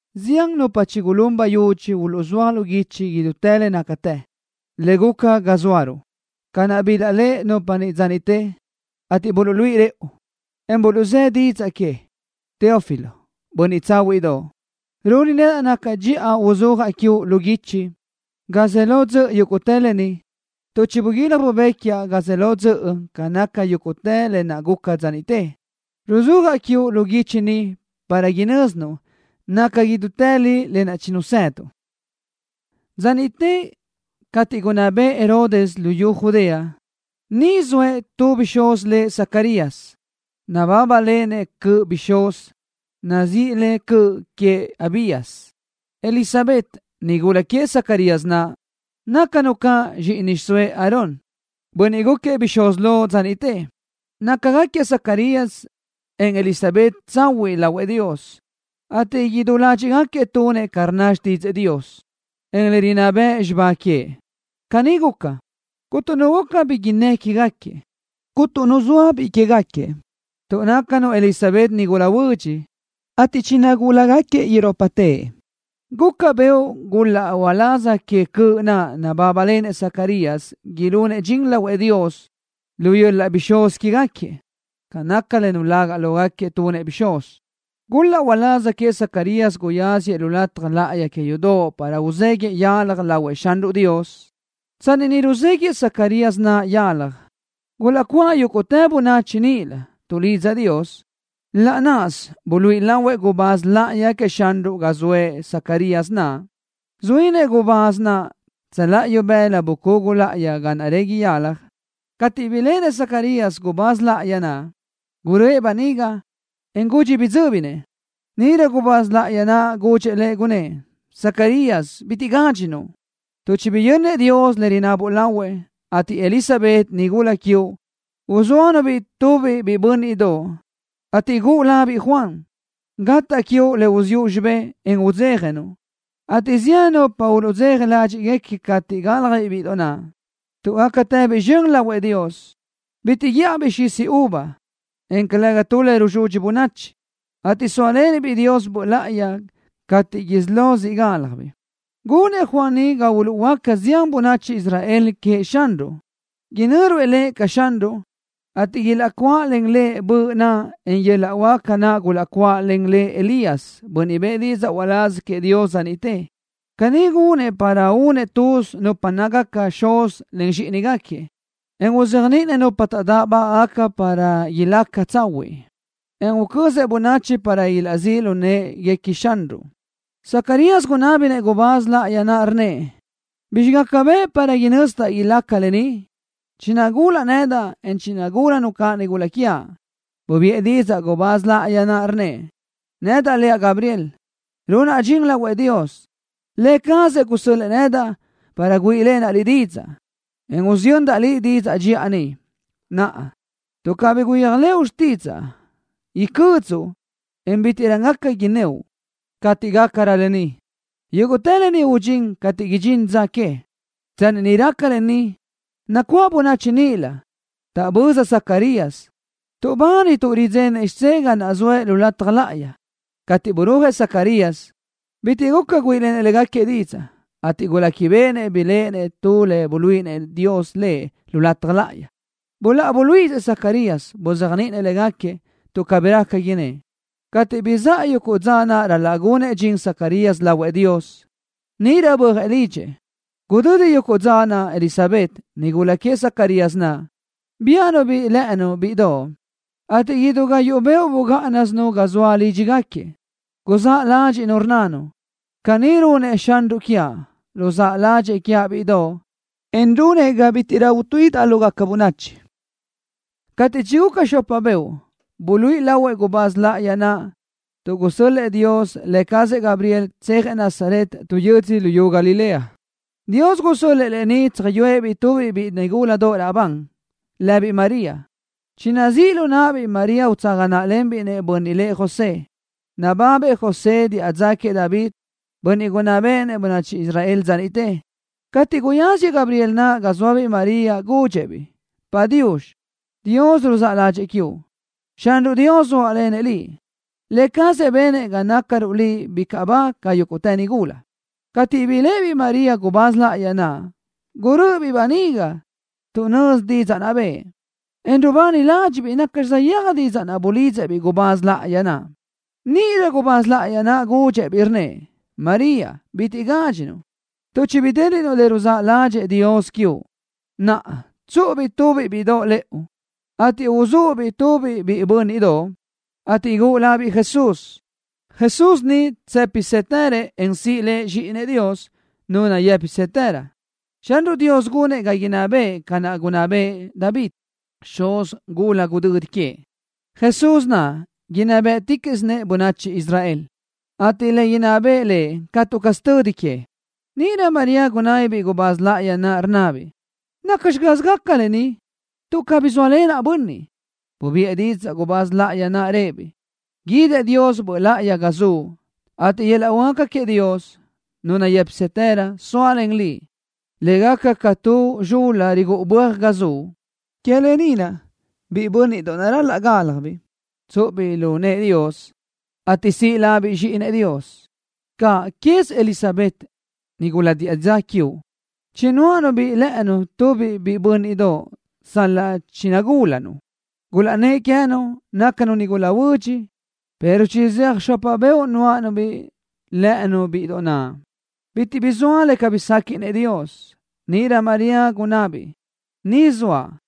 Zián nupa chigulún bayudxi uluʼzúaj lu guichi idútë le nácatë, le guca ga zóaruʼ, ca naʼ bilaʼléʼe nupa niʼ dza niʼte, ateʼ buluʼluíʼi rëʼu, en buluʼzë́ didzaʼ que. Teófilo, bönniʼ tsáhuiʼdoʼ, runi nedaʼ naca dxiʼa uzúajaʼ quiuʼ lu guichi, ga ze lo dzöʼ yúguʼtë lë ni, tuʼ chibuguílaj bubéquiaʼ ga ze lo dzöʼ ca naca yúguʼtë lë naʼ guca dza niʼte. Ruzúajaʼ quiuʼ lu guichi ni para inö́zinuʼ naca idútë li lë naʼ chinazëduʼ. Dza niʼte cateʼ gunná bëʼë Herodes luyú Judea, niʼ zoëʼ tu bixúz lëʼ Zacarías. Nabábalenëʼ cöʼ bixúz, nazíʼi le Cöʼ Queëʼ Abías. Elisabet, nigula queëʼ Zacarías naʼ nácanu caʼ zxíʼini xiʼsóëʼ Aarón, bönniʼ gúquiëʼ bixúz lo dza niʼte. Nácagaquiëʼ Zacarías, en Elisabet tsahuiʼ lahuëʼ Dios, ateʼ idú ládxiʼgaquiëʼ tunëʼ ca rnna xtídzëʼë Dios, en le rinná bëʼ xibá queëʼ. Caní guca, cuntu nu guca bi innë́ quégaquiëʼ. Cuntu nu zoa biʼi quégaquiëʼ, tuʼ nácanu Elisabet nigula huödx, ateʼ chinagúlagaquiëʼ irópatëʼ. Guca beoʼ gul-laʼ uláz que cöʼ naʼ nabábalenëʼ Zacarías ilunëʼ dxin lahuëʼ Dios, lu yöl-laʼ bixúz quégaquiëʼ. Ca naca le nulaga lógaquiëʼ tunëʼ bixúz, gul-laʼ uláz queëʼ Zacarías guyáziëʼ lu lataj láʼayi que yudoʼ para uzéguiʼë yalaj lahuëʼ Xanruʼ Dios. Tsanni niʼ ruzéguiʼë Zacarías naʼ yalaj, gulaʼcuáʼ yúguʼtë bönachi níʼilö, tuʼlidza Dios. Laʼ náʼasö buluíʼi lahuëʼ gubáz láʼayi queëʼ Xanruʼ ga zoëʼ Zacarías naʼ. Zuínëʼ gubáz naʼ tsöláʼa ibëla bucugu láʼayi ga naʼ régui yalaj. Cateʼ biléʼenëʼ Zacarías gubáz láʼayi naʼ, guröʼë böniga, en gudxi bidzö́binëʼ. Níʼirö gubáz láʼayi naʼ gudxëʼ lëʼ, gunnë́ʼ: —Zacarías, bitiʼ gádxinuʼ, tuʼ chibiyönnëʼ Dios le rinabuʼ lahuëʼ, ateʼ Elisabet, nigula quiuʼ, uzóanu-biʼ tubiʼ biʼi bö́nniʼdoʼ, ateʼ guʼu labiʼ Juan. Gataʼ quiuʼ le uziʼu xibé, en udzéjanuʼ, ateʼ zián nupa uluʼdzeja ládxiʼgaca cateʼ gálajbiʼ bíʼidoʼ naʼ, tuʼ gácatëbiʼ zxön lahuëʼ Dios. Bitiʼ guíʼajbiʼ xisi uva, en calëga tu le rusudxi bönachi, ateʼ sóalenëʼ-biʼ Dios Böʼ Láʼayi cateʼ isí lo siʼ gálajbiʼ. Gunëʼ Juan ni ga uluʼhuöáca zián bönachi Israel queëʼ Xanruʼ. Inö́ruëʼ lëʼ ca Xanruʼ, ateʼ ilaʼcuáʼalen lëʼ Böʼ naʼ, en yöl-laʼ huáca naʼ gulaʼcuáʼalen Elías, bönniʼ bëʼë didzaʼ uláz queëʼ Dios dza niʼte. Caní gunëʼ para únëʼ tuz nupa nácagaca xuz len zxíʼinigaquiëʼ, en uzéajniʼinëʼ nupa taʼdáʼbagaʼ para ilácagaca tsahuiʼ, en ucözëʼ bönachi para ilaʼzíʼ lu në́ʼeguequi Xanruʼ. Zacarías gunábinëʼ gubáz láʼayi naʼ, rnnëʼ: —¿Bizxi gaca bëʼ para inözdaʼ ilaca lë ni? Chinagúlaʼ nedaʼ, en chinagúlanu caʼ nigula quiaʼ. Bubiʼë didzaʼ gubáz láʼayi naʼ, rnnëʼ: —Nedaʼ leaʼ Gabriel. Runaʼ dxin lahuëʼ Dios. Lë cazëʼ gusö́l-lëʼë nedaʼ para güíʼilenaʼ liʼ didzaʼ, en usiyöndaʼ liʼ didzaʼ dxiʼa ni. Naʼa, tuʼ cabí guyéajlëʼu xtídzaʼa, icödzuʼ, en bítiʼrö gaca innóʼ cateʼ gácarö lë ni. Yúguʼtë lë ni udxín cateʼ idxín dza que. Tsanni niʼ raca lë ni, nacuáʼ bönachi níʼilö, taʼböza Zacarías, ateʼ tuʼbani tuʼ ridzenëʼ xidzé ga naʼ zoëʼ lu lataj láʼayi. Cateʼ burúajëʼ Zacarías, bitiʼ guca güíʼilenëʼ légaquiëʼ didzaʼ, ateʼ guléquibeʼenëʼ biléʼenëʼ tu le buluíʼinëʼ Dios lëʼ lu lataj láʼayi. Buláʼa buluíʼisëʼ Zacarías, buzéajniʼinëʼ légaquiëʼ, tuʼ cabí raca innë́ʼ. Cateʼ bizáʼa yuguʼ dza naʼ ral-laʼ gunëʼ dxin Zacarías lahuëʼ Dios, níʼirö bö́ajëʼ lidxëʼ. Gudödi yuguʼ dza naʼ Elisabet, nigula queëʼ Zacarías naʼ, biáʼanu-biʼ lë́ʼënu bíʼidoʼ, ateʼ idú gayuʼ beoʼ bugáʼanasinu ga zoa lídxigaquiëʼ. Guzáʼ ládxiʼnu, rnnanu: “Caní runëʼ Xanruʼ quiaʼ. Ruzáʼ ládxëʼë quiaʼ bíʼidoʼ, en runëʼ ga bítiʼrö utuíʼidaʼ lógaca bönachi.” Cateʼ chiguca xopa beoʼ, buluíʼi lahuëʼ gubáz láʼayi naʼ, tuʼ gusö́l-lëʼë Dios lë cazëʼ Gabriel, tsejëʼ Nazaret, tu yödzö luyú Galilea. Dios gusö́l-lëʼë lëʼ niʼ tsöjyúëʼ-biʼ tubiʼ biʼi nigula raʼbandoʼ lëbiʼ María. Chinazíʼ lu náʼabiʼ María utsaga náʼalenbiʼ-nëʼ bönniʼ lëʼ José. Nababëʼ José diʼa dza queëʼ David, bönniʼ gunná béʼenëʼ bönachi Israel dza niʼte. Cateʼ guyáziëʼ Gabriel naʼ ga zóabiʼ María, gudxëʼ-biʼ: —Padiux. Dios ruzáʼ ládxëʼë quiuʼ. Xanruʼ Dios zóalenëʼ liʼ. Lë cazëʼ benëʼ ga nácaruʼ liʼ bicaʼ ba ca yúguʼtë nigula. Cateʼ biléʼebiʼ María gubáz láʼayi naʼ, gurö́ʼöbiʼ böniga tuʼ nözi didzaʼ naʼ bëʼë, en rubani ládxiʼbiʼ nacxi saʼyéaj didzaʼ naʼ bulidzëʼ-biʼ gubáz láʼayi naʼ. Níʼirö gubáz láʼayi naʼ gudxëʼ-biʼ, rnnëʼ: —María, bitiʼ gádxinuʼ, tuʼ chibidéliʼnuʼ le ruzáʼ ládxëʼë Dios quiuʼ. Naʼa, tsúʼubiʼ tubiʼ bíʼidoʼ lëʼu, ateʼ uzúʼ-biʼ tubiʼ biʼi bö́nniʼdoʼ, ateʼ guʼu labiʼ Jesús. Jesús ni tsë́pisëtërëʼ, en siʼ Lëʼ Zxíʼinëʼ Dios, Nu nayë́pisëtërö. Xanruʼ Dios gunëʼ ga inná bëʼë ca naʼ gunná bëʼë David, xuz gula gudödi queëʼ. Jesús naʼ inná béʼeticaʼsinëʼ bönachi Israel, ateʼ le inná bëʼë Lëʼ catu caz tödi que. Níʼirö María gunábibiʼ gubáz láʼayi naʼ, rnnabiʼ: —¿Nacxi caz gaca lë ni, tuʼ cabí zóalenaʼ bönniʼ? Bubiʼë didzaʼ gubáz láʼayi naʼ, rëʼë-biʼ: —Guidëʼ Dios Böʼ Láʼayi ga zuʼ, ateʼ yöl-laʼ huáca queëʼ Dios, Nu nayë́pisëtërö, sóalen liʼ, le gaca ca tu zxul-la rigúʼu böaj ga zuʼ. Que lë ni naʼ biʼi bö́nniʼdoʼ naʼ ral-laʼ gálajbiʼ, tsúʼubiʼ lu nëʼë Dios, ateʼ siʼ labiʼ Zxíʼinëʼ Dios. Cáʼanqueze Elisabet, nigula diʼa dza quiuʼ, chinuáʼanu-biʼ lë́ʼënu tubiʼ biʼi bö́nniʼdoʼ sal-laʼ chinagúlanu. Gulaʼnnë́ʼ queë́nu: “Nácanu nigula huödx”, pero chizéaj xopa beoʼ nuáʼanu-biʼ lë́ʼënu bíʼidoʼ naʼ. Bitiʼ bi zoa le cabí séquiʼnëʼ Dios. Níʼirö María gunabiʼ: —Ni zoaʼ.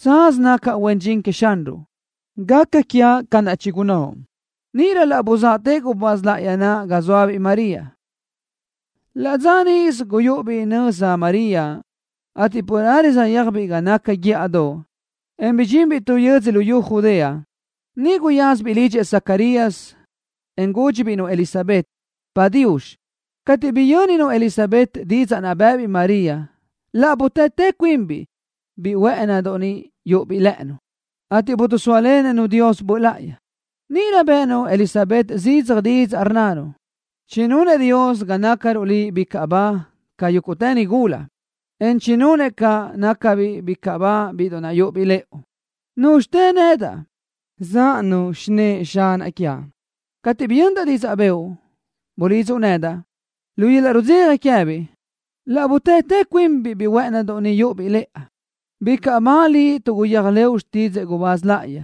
Tsaz nacaʼ huen dxin queëʼ Xanruʼ. Gaca quiaʼ ca naʼ chigunnóʼ. Níʼirö laʼ buzaʼtëʼ gubáz láʼayi naʼ ga zóabiʼ María. Laʼ dza níʼisö guyúʼubiʼ nöza María, ateʼ carelö saʼyéajbiʼ ga naca guíʼadoʼ, en bidxinbiʼ tu yödzö luyú Judea. Niʼ guyázabiʼ lidxëʼ Zacarías, en gúdxibiʼ-nu Elisabet: —Padiux. Cateʼ biyö́ninu Elisabet didzaʼ naʼ bë́ʼëbiʼ María, laʼ butátë cuinbiʼ biʼi huë́ʼënidoʼ naʼ yúʼubiʼ lë́ʼënu, ateʼ bidisóalenëʼ-nu Dios Böʼ Láʼayi. Níʼirö bë́ʼënu Elizabet zidzaj didzaʼ, rnnanu: —¡Chinunëʼ Dios ga nácaruʼ liʼ bicaʼ ba ca yúguʼtë nigula, en chinunëʼ caʼ ga nácabiʼ bicaʼ ba bíʼidoʼ naʼ yúʼubiʼ lëʼu! ¿Núzxitë nedaʼ, záʼanu xinë́ʼë Xanaʼ quiaʼ? Cateʼ biyöndaʼ didzaʼ bëʼu, bulidzuʼ nedaʼ, lu yöl-laʼ rudzeja queë́biʼ laʼ butátë cuinbiʼ biʼi huë́ʼënidoʼ ni yúʼubiʼ lëʼa. ¡Bicaʼ ba liʼ tuʼ guyéajlëʼu xtídzëʼë gubáz láʼayi,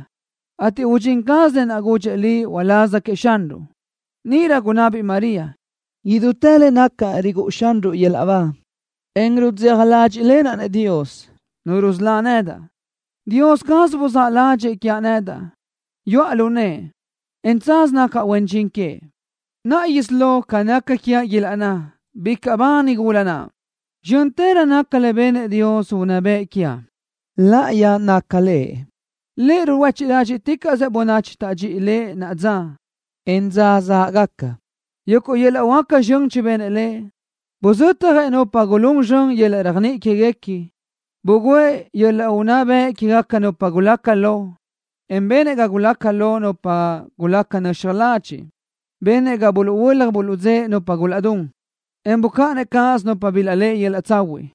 ateʼ udxín caz lë naʼ gudxëʼ liʼ uláz queëʼ Xanruʼ! Níʼirö gunabiʼ María: ¡Idútë le nacaʼ rigúʼu Xanruʼ yöl-laʼ ba, en rudzeja ládxiʼlenaʼ-nëʼ Dios, Nu rusölá nedaʼ! ¡Dios caz buzáʼ ládxëʼë quiaʼ nedaʼ! Yuʼa lu nëʼë, en tsaz nacaʼ huen dxin queëʼ. Naʼa isí lo, ca naca quiaʼ ilaʼnná: Bicaʼ ba nigula naʼ. ¡Zxö́ntërö naca le benëʼ Dios unná bëʼ quiaʼ! ¡Láʼayi naca Lëʼ! Lëʼ ruhuéchiʼ ládxiʼticaʼsëʼ bönachi tadxi Lëʼ naʼa dza, en dza záʼgaca. Yuguʼ yöl-laʼ huáca zxön chibenëʼ Lëʼ. Buzötjëʼ nupa gulún zxön yöl-laʼ réajniʼi quéguequi. Bugǘëʼ yöl-laʼ unná bëʼ quégaca nupa gulaca lo, en benëʼ ga gulaca lo nupa gulaca nöxaj ladxiʼ. Benëʼ ga buluʼhuö́laj buluʼdzë́ʼe nupa gulaʼdún, en bucáʼanëʼ cáʼasö nupa bilaʼléʼe yöl-laʼ tsahuiʼ.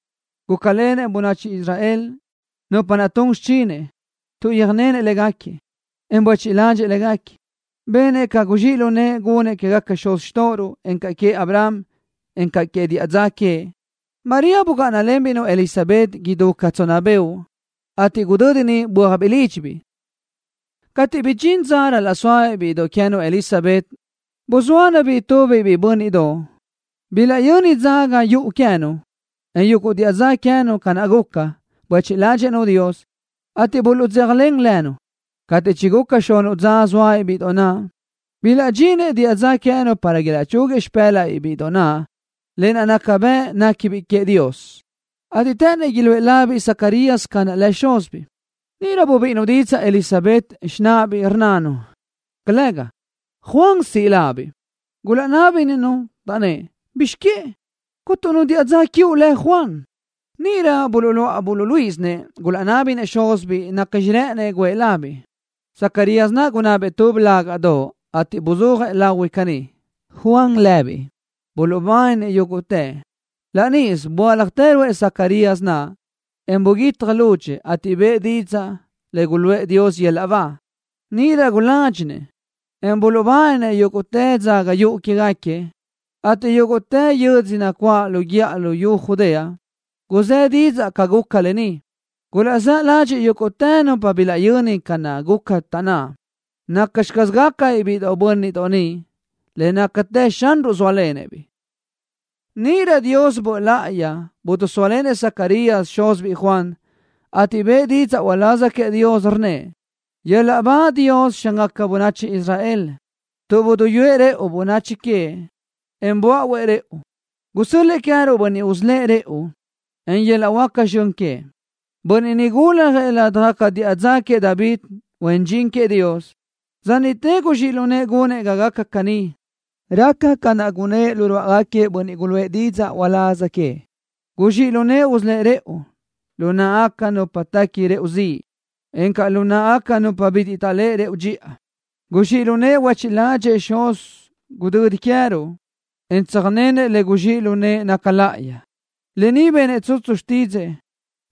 Gúcalenëʼ bönachi Israel, nupa naʼ tun xichinëʼ, tuʼ yöjnenëʼ légaquiëʼ, en buéchiʼ ládxëʼë légaquiëʼ. Benëʼ ca guzxíʼ lu nëʼë gunëʼ quégaquiëʼ xuz xtóʼoruʼ encaʼ queëʼ Abraham, en quégaca diʼa dza queëʼ. María bugáʼanalenbiʼ-nu Elisabet idú ca tsonna beoʼ, ateʼ gudödi niʼ bö́ajbiʼ lídxibiʼ. Cateʼ bidxín dza ral-laʼ sóabiʼ bíʼidoʼ queë́nu Elisabet, buzóanu-biʼ tubiʼ biʼi bö́nniʼdoʼ. Bilaʼyöni dzaga yuʼu queë́nu, en yuguʼ diʼa dza queë́nu ca naʼ guca, buéchiʼ ládxëʼë-nu Dios, ateʼ buluʼdzéjalen lënu. Cateʼ chiguca xunuʼ dza zóabiʼ bíʼidoʼ naʼ, bilaʼdxinëʼ diʼa dza queë́nu para ilaʼchúguiëʼ lu xipë́laʼbiʼ biʼi bö́nniʼdoʼ naʼ lë naʼ gaca bëʼ néquibiʼ queëʼ Dios, ateʼ të́ʼënnëʼ iluʼë labiʼ Zacarías ca naʼ lëʼ xúzibiʼ. Níʼirö bubíʼinu didzaʼ Elisabet, xináʼabiʼ, rnnanu: —Calëga. Juan siʼ labiʼ. Gulaʼnábinëʼ-nu, taʼnnë́ʼ: —¿Bizx que? Cuntu nu diʼa dza quiuʼ lëʼ Juan. Níʼirö buluʼláʼ buluʼluíʼisinëʼ, gulaʼnábinëʼ xúzibiʼ nacxi rë́ʼënëʼ guʼë labiʼ. Zacarías naʼ gunabëʼ tu blágadoʼ, ateʼ buzúajëʼ lahui caní: Juan lëbiʼ. Buluʼbáninëʼ yúguʼtëʼ. Laʼ níʼisö böáljatë ruʼë Zacarías naʼ, en buguítjatë lúdxëʼë, ateʼ bëʼë didzaʼ le guluʼë Dios yöl-laʼ ba. Níʼirö guládxinëʼ, en buluʼbáninëʼ yúguʼtë dzaga yuʼu quégaquiëʼ, ateʼ yúguʼtë yö́dzödoʼ nacuáʼ lu guíʼadoʼ luyú Judea, guzë́ didzaʼ ca guca lë ni. Gulaʼzáʼ ládxiʼgaca yúguʼtë nupa bilaʼyöni ca naʼ guca, taʼnná: “¿Nacxi caz gácabiʼ biʼi bö́nniʼdoʼ ni? Le nácatë Xanruʼ zóalenëʼ-biʼ.” Níʼirö Dios Böʼ Láʼayi bidisóalenëʼ Zacarías, xúzibiʼ Juan, ateʼ bëʼë didzaʼ uláz queëʼ Dios, rnnëʼ: ¡Yöl-laʼ ba Dios, Xángaca bönachi Israel tuʼ buduyúëʼ rëʼu, bönachi queëʼ, en böáʼuëʼ rëʼu! ¡Gusö́l-lëʼë queë́ruʼ Bönniʼ usölë́ʼ rëʼu, len yöl-laʼ huáca zxön queëʼ! Bönniʼ ni guljëʼ ládajgaca diʼa dza queëʼ David, huen dxin queëʼ Dios. ¡Dza niʼte guzxíʼ lu nëʼë gunëʼ ga gaca caní! Raca ca naʼ gunnë́ʼ lu ruáʼagaquiëʼ bönniʼ guluʼë didzaʼ uláz queëʼ. Guzxíʼ lu nëʼë usölë́ʼ rëʼu lu náʼagaca nupa tequi rëʼu ziʼ, encaʼ lu náʼagaca nupa bitiʼ taʼléʼe rëʼu dxiʼa. Guzxíʼ lu nëʼë huéchiʼ ládxëʼë xuz gudödi queë́ruʼ, en tsöjnenëʼ le guzxíʼ lu nëʼë le naca láʼayi. Lë ni benëʼ tsutsu xtídzëʼë,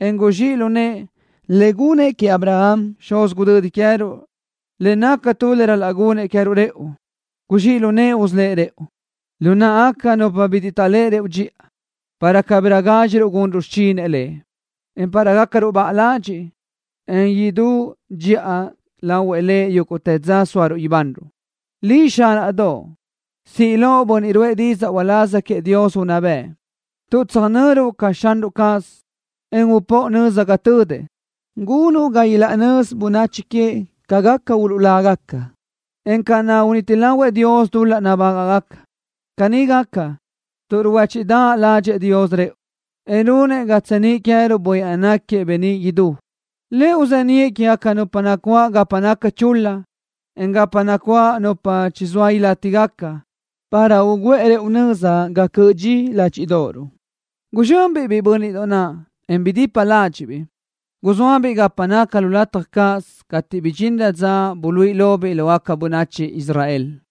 en guzxíʼ lu nëʼë, le gunëʼ queëʼ Abraham, xuz gudödi queëruʼ, le naca tu le ral-laʼ gunëʼ queë́ruʼ rëʼu. Guzxíʼ lu nëʼë usölë́ʼ rëʼu lu náʼagaca nupa bitiʼ taʼléʼe rëʼu dxiʼa para cabirö gádxiruʼ gunruʼ xichinëʼ Lëʼ, en para gácaruʼ baʼa ladxiʼ, en idú dxiʼa lahuëʼ Lëʼ yúguʼtë dza sóaruʼ ibanruʼ. Liʼ, zxíʼinaʼdoʼ, siʼ loʼ bönniʼ ruʼë didzaʼ uláz queëʼ Dios unná bëʼ tuʼ tsöjnöruʼ ca Xanruʼ caz, en upóʼo nöza ga tödëʼ. Gunuʼ ga ilaʼnözi bönachi queëʼ ca gaca uluʼlágaca, en ca naʼ uniti lahuëʼ Dios dul-laʼ nabágaʼgaca. Caní gaca, tuʼ ruhuéchiʼdaʼ ládxëʼë Dios rëʼu, en runëʼ ga tseníʼ queë́ruʼ Bönniʼ naʼ náquiëʼ beníʼ idú. Lëʼ uzeníʼë quégaca nupa nacuáʼ gapa naca chul-la, en gapa nacuáʼ nupa chizóa ilátigaca para ugúʼë rëʼu nöza ga cöʼö dxi ládxiʼdoʼoruʼ. Guzxönbiʼ biʼi bö́nniʼdoʼ naʼ, en bidipa ládxiʼbiʼ. Guzóasibiʼ gapa naca lu lataj cáʼasö cateʼ bidxinrö dza buluíʼi lobiʼ lógaca bönachi Israel.